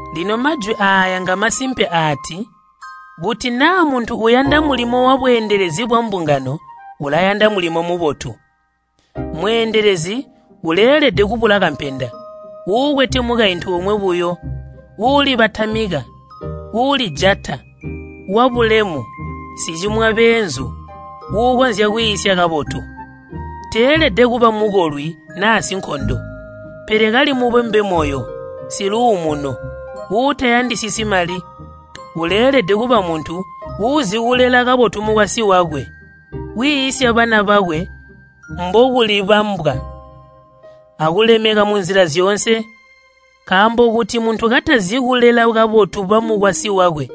Lino majwi aaya ngamasimpe aati, kuti naa muntu uyanda mulimo wabweendelezi bwambungano ulayanda mulimo mubotu. Mweendelezi uleelede kubula kampenda, uukwete mukaintu omwe buyo, uulibatamika, uulijata, wabulemu, sicimwa beenzu, uukonzya kwiisya kabotu. Teelede kuba mukolwi naa sinkondo, pele kali mubombe moyo, siluumuno, uutayandisisyi mali. Uleelede kuba muntu uuzikulela kabotu mukwasyi wakwe, wiisya bana bakwe mbokulibambwa akulemeka munzila zyoonse. Nkaambo kuti muntu katazi kulela kabotu bamukwasyi wakwe,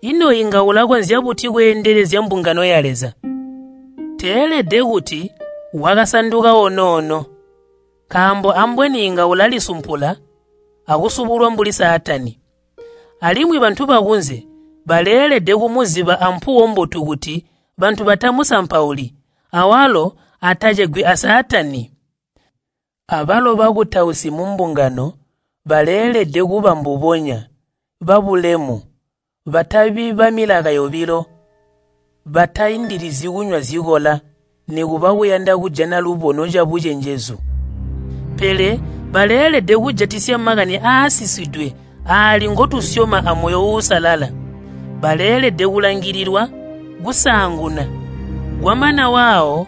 ino inga ulakonzya buti kweendelezya mbungano ya Leza? Teelede kuti wakasanduka onoono. Nkaambo ambweni inga ulalisumpula akusubulwa mbuli Saatani. Alimwi bantu bakunze baleelede kumuziba ampuwo mbotu kuti bantu batamusampauli awalo atacegwi a Saatani. Abalo bakutausi mumbungano baleelede kuba mbubonya, babulemu, batabi bamilaka yobilo, bataindilizyi kunywa zikola nikuba kuyanda kujana lubono cabucenjezu. Pele baleelede kujatisya makani aasisidwe aali ngotusyoma amoyo uusalala. Baleelede kulangililwa kusaanguna, kwamana waawo,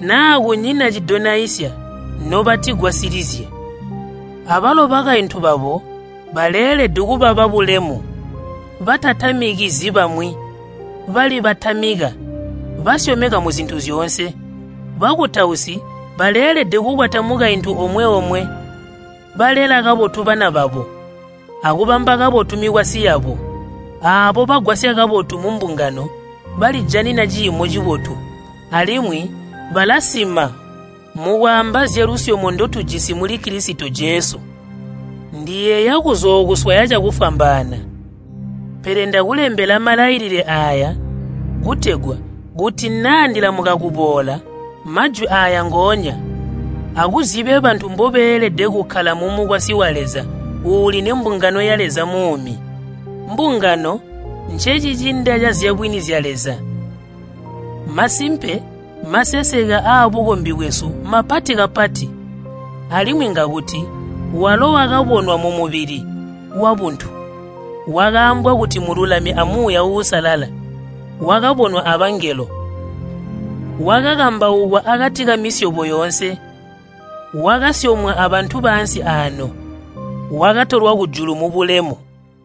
naa kunyina cidonaisya, nobatigwasilizye. Abalo bakaintu babo baleelede kuba babulemu, batatamikizyi bamwi, balibatamika basyomeka muzintu zyoonse. Bakutausi baleelede kukwata mukaintu omwe-omwe, balela kabotu bana babo akubamba kabotu mikwasyi yabo. Aabo bagwasya kabotu mumbungano balijanina ciimo cibotu, alimwi balasima mukwaamba zyalusyomo ndotujisi muli Kilisito Jesu. Ndiyeeya kuzookuswaya cakufwambaana. Pele ndakulembela malailile aaya kutegwa kuti naa ndilamuka kuboola, majwi aaya ngoonya akuzibye bantu mbobeelede kukkala mumukwasyi wa Leza uuli nembungano ya Leza muumi. Mbungano ncecicinda cazyabwini zya Leza. Masimpe maseseke aabukombi bwesu mapati kapati. Alimwi ngakuti, Walo wakabonwa mumubili wabuntu, wakaambwa kuti mululami a Muuya Uusalala, wakabonwa abangelo. Wakakambaukwa akati kamisyobo yoonse, wakasyomwa abantu baansi aano, wakatolwa kujulu mubulemu.